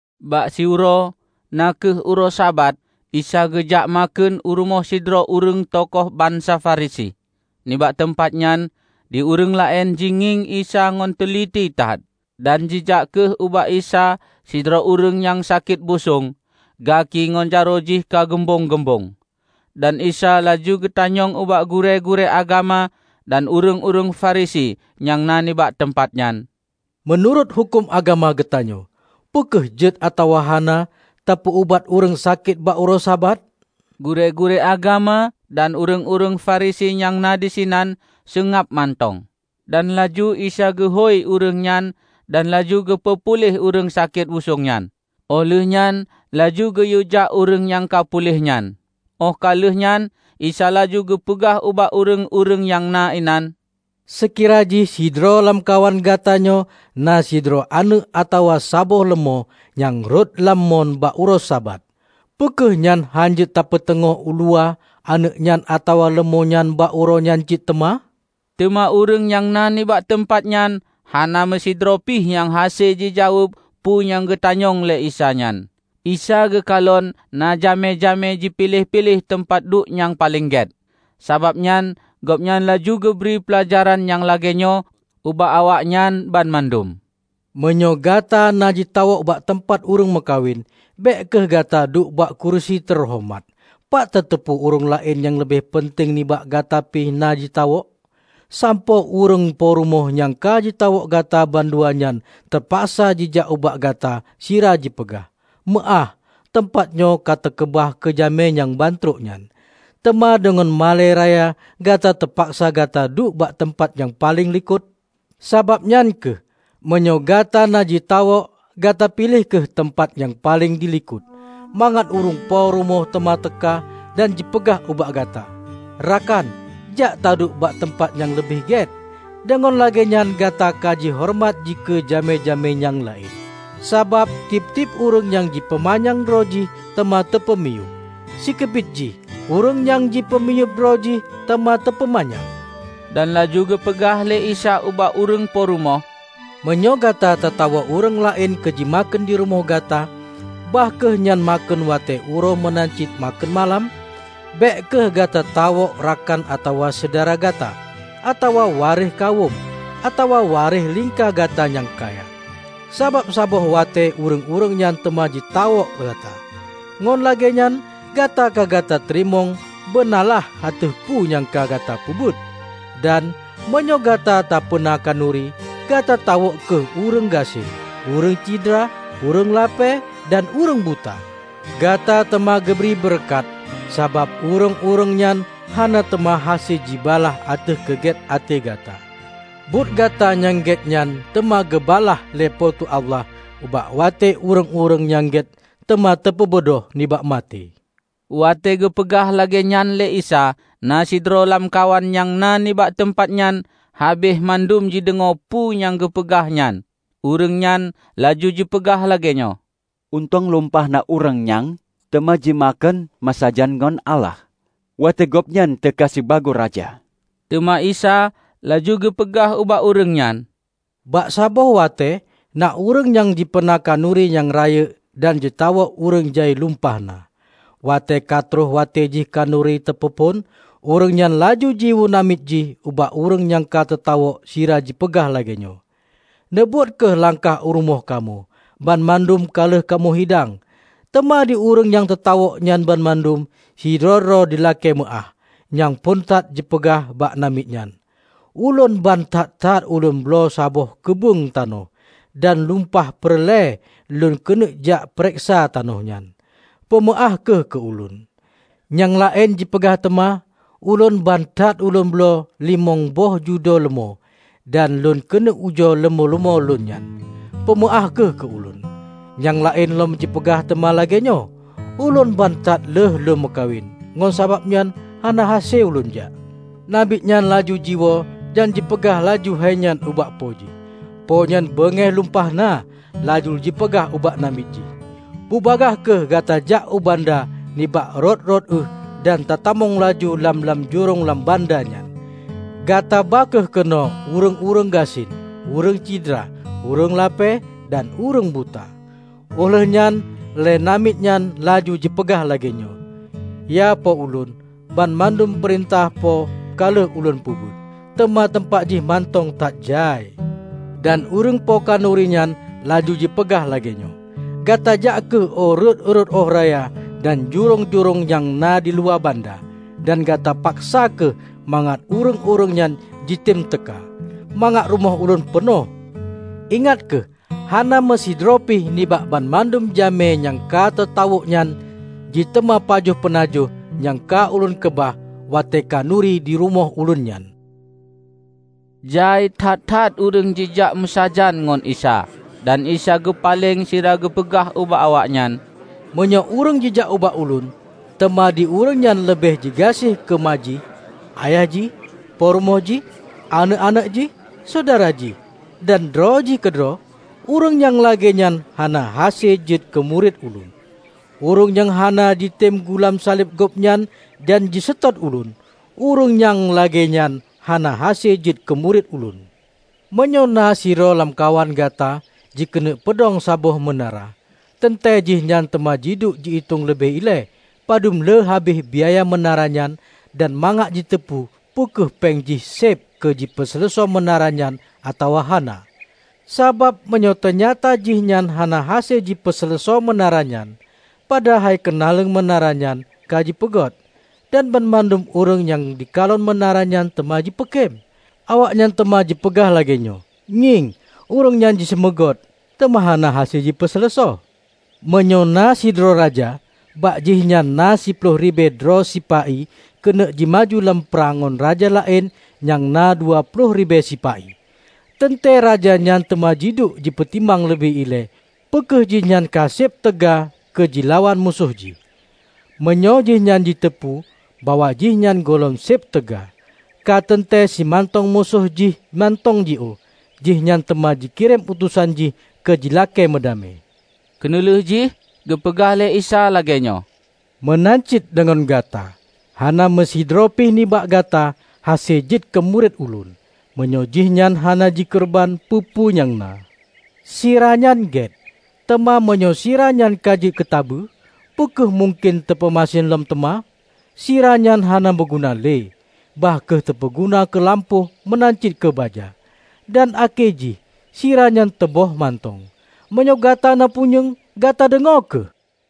Bak siuroe na kheueh uroe Sabat, Isa geujak makheun u rumoh sidroe ureuëng tokoh bansa Farisi. Nibak teumpat nyan di ureuëng laén jingieng Isa ngon teuliti that. Dan jijak kheueh ubak Isa sidroe ureuëng sakét busong gaki ngon jaroe jih ka gumbong-gumbong. Dan Isa laju geutanyong ubak gurée-gurée agama dan ureuëng-ureuëng Farisi nyang na nibak teumpat nyan, "Meunurot huköm agama geutanyoe, peu kheueh jeuet atawa hana tapeu-ubat ureuëng sakét bak uroe Sabat?" Gurée-gurée agama dan ureuëng-ureuëng Farisi nyang na disinan seungab mantong. Dan laju Isa geuhôi ureuëng nyan dan laju geupeu puléh ureuëng sakét busong nyan, óh lheueh nyan laju geuyue jak ureuëng nyang ka puléh nyan. Óh ka lheueh nyan Isa laju geupeugah ubak ureuëng-ureuëng nyang na inan, "Seukira jih sidroe lamkawan gata nyoe na sidroe aneuëk atawa saboh leumô nyang rhot lam mon bak uroe Sabat, peu kheueh nyan hán jeuet tapeuteungoh uluwa aneuëk nyan atawa leumô nyan bak uroe nyan cit teuma?" Teuma ureuëng nyang na nibak teumpat nyan hana meusidroe pih nyang hase jijaweueb peue nyang geutanyong lé Isa nyan. Isa geukalon na jamé-jamé jipiléh-piléh teumpat duek nyang paleng gét. Sabab nyan gobnyan laju geubri peulajaran nyang lagée nyoe ubak awaknyan banmandum. "Meunyoe gata na jitawök bak teumpat ureuëng meukawen, bék kheueh gata duek bak kurusi teuhoreumat. Pat tateupeue ureuëng laén nyang leubeh peunteng nibak gata pih na jitawök, sampoe ureuëng po rumoh nyang ka jitawök gata bandua nyan teupaksa jijak ubak gata sira jipeugah, 'Meuáh, teumpat nyoe ka teukeubah keu jamé nyang bantrok nyan.' Teuma deungon malée raya gata teupaksa gata duek bak teumpat nyang paleng likot. Sabab nyan kheueh, meunyoe gata na jitawök, gata piléh kheueh teumpat nyang paleng dilikot, mangat ureuëng po rumoh teuma teuka dan jipeugah ubak gata, 'Rakan, jak taduek bak teumpat nyang leubeh gét.' Deungon lagée nyan gata kajihoreumat dikeue jamé-jamé nyang laén. Sabab tieb-tieb ureuëng nyang jipeumanyang droe jih teuma teupeumiyueb, sikeubiet jih ureuëng nyang jipeumiyueb droe jih teuma teupeumanyang." Dan laju geupeugah lé Isa ubak ureuëng po rumoh, "Meunyoe gata tatawök ureuëng laén keu jimakheun di rumoh gata bah kheueh nyan makheun watée uroe meunan cit makheun malam, bék kheueh gata tawök rakan atawa syedara gata, atawa waréh kawöm, atawa waréh lingka gata nyang kaya. Sabab saboh watée ureuëng-ureuëng nyan teuma jitawök gata, ngon lagée nyan gata ka gata teurimong beunalaih ateueh peue nyang ka gata peubuet. Dan, meunyoe gata tapeuna khanuri, gata tawök kheueh ureuëng gasien, ureuëng cidra, ureuëng lapée, dan ureuëng buta. Gata teuma geubri beureukat, sabab ureuëng-ureuëng nyan hana teuma hase jibalaih ateueh keugét até gata. Buet gata nyang gét nyan teuma geubalaih lé Po teu Allah bak watée ureuëng-ureuëng nyang gét teuma teupeubeudôh nibak maté." Watée geupeugah lagée nyan lé Isa, na sidroe lamkawan nyang na nibak teumpat nyan habéh mandum jideungoe peue nyang geupeugah nyan, ureuëng nyan laju jipeugah lagée nyoe, "Untông lumpah na ureuëng nyang teuma jimakheun meusajan ngon Allah watée Gobnyan teuka sibagoe Raja!" Teuma Isa laju geupeugah ubak ureuëng nyan, "Bak saboh watée na ureuëng nyang jipeuna khanuri nyang rayeuk dan jitawök ureuëng jai lumpah na. Watée katroh watée jih khanuri teupeuphon, ureuëng nyan laju jiyue namiet jih ubak ureuëng nyang ka teutawök sira jipeugah lagée nyoe, 'Neubot kheueh langkah u rumoh kamoe, banmandum ka lheueh kamoe hidang!' Teuma di ureuëng nyang teutawök nyan banmandum, sidroe-droe jilakée meuáh. Nyang phon that jipeugah bak namiet nyan, 'Ulôn ban that-that ulôn bloe saboh keubeueng tanoh, dan lumpah peureulée lôn keuneuk jak pareksa tanoh nyan. Peumeuáh kheueh keu ulôn.' Nyang laén jipeugah teuma, 'Ulôn ban that ulôn bloe limong boh judo leumô, dan lôn keuneuk ujoe leumô-leumô lôn nyan. Peumeuáh kheueh keu ulôn!' Nyang laén lom jipeugah teuma lagée nyoe, 'ulôn ban that lheueh lôn meukawen, ngon sabab nyan hana hase ulôn jak.' Namiet nyan laju jiwoe dan jipeugah laju hai nyan ubak Po jih, Po nyan beungéh lumpah na, laju jipeugah ubak namiet jih, 'Bubagaih kheueh gata jak u banda nibak rot-rot euh dan tatamong laju lam-lam jurông lam banda nyan. Gata ba kheueh keunoe ureuëng-ureuëng gasien, ureuëng cidra, ureuëng lapée dan ureuëng buta.' Óh lheueh nyan lé namiet nyan laju jipeugah lagée nyoe, 'Ya Po ulôn, banmandum peurintah Po ka lheueh ulôn peubuet, teuma teumpat jih mantong that jai.' Dan ureuëng Po khanuri nyan laju jipeugah lagée nyoe, 'Gata jak kheueh u rot-rot ueh raya dan jurông-jurông nyang na diluwa banda, dan gata paksa kheueh mangat ureuëng-ureuëng nyan jitem teuka, mangat rumoh ulôn peunoh. Ingat kheueh! Hana meusidroe pih nibak banmandum jamé nyang ka teutawök nyan jiteumé pajoh peunajoh nyang ka ulôn keubah watée khanuri dirumoh ulôn nyan!' " Jai that-that ureuëng jijak meusajan ngon Isa, dan Isa geupaleng sira geupeugah ubak awaknyan, "Meunyoe ureuëng jijak ubak Ulôn, teuma di ureuëng nyan leubeh jigaséh keu ma jih, ayah jih, peurumoh jih, aneuëk-aneuëk jih, syedara jih, dan droe jih keudroe, ureuëng nyang lagée nyan hana hase jeuet keu murit Ulôn. Ureuëng nyang hana jitem gulam saleb gobnyan dan jiseutôt Ulôn, ureuëng nyang lagée nyan hana hase jeuet keu murit Ulôn. Meunyoe na sidroe lamkawan gata jikeuneuk peudong saboh meunara, teuntée jihnyan teuma jiduek ji-itong leubeh ilée padub le habéh biaya meunara nyan dan mangat jiteupeu peu kheueh péng jih séb keu jipeuseuleusoe meunara nyan atawa hana. Sabab meunyoe teunyata jihnyan hana hase jipeuseuleusoe meunara nyan, padahai keunaleueng meunara nyan ka jipeugôt, dan banmandum ureuëng nyang jikalon meunara nyan teuma jipeukém. Awaknyan teuma jipeugah lagée nyoe, 'Ngieng, ureuëng nyan jiseumeugôt, teuma hana hase jipeuseuleusoe!' Meunyoe na sidroe raja bak jihnyan na siploh ribée droe sipa-i keuneuk jimaju lam prang ngon raja laén nyang na dua ploh ribée sipa-i, teuntée raja nyan teuma jiduek jipeutimang leubeh ilée peu kheueh jihnyan ka seb teuga keu jilawan musoh jih, Meunyoe jihnyan jiteupeu bahwa jihnyan gohlom séb teuga, kateuntée simantong musoh jih mantong jiôh, jihnyan teuma jikirém utosan jih keu jilakée meudamé." Keuneulheueh jih geupeugah lé Isa lagée nyoe, "Meunan cit deungon gata. Hana meusidroe pih nibak gata hase jeuet keu murit Ulôn, meunyoe jihnyan hana jikeureubeuen peue-peue nyang na." "Sira nyan gét, teuma meunyoe sira nyan ka jeuet keutabeue, peu kheueh mungken teupeumasen lom teuma? Siranyan hana meuguna le, bah kheueh teupeuguna keu lampôh meunan cit keu baja. Dan akhé jih sira nyan teuböh mantong. Meunyoe gata na punyueng, gata deungoe kheueh!"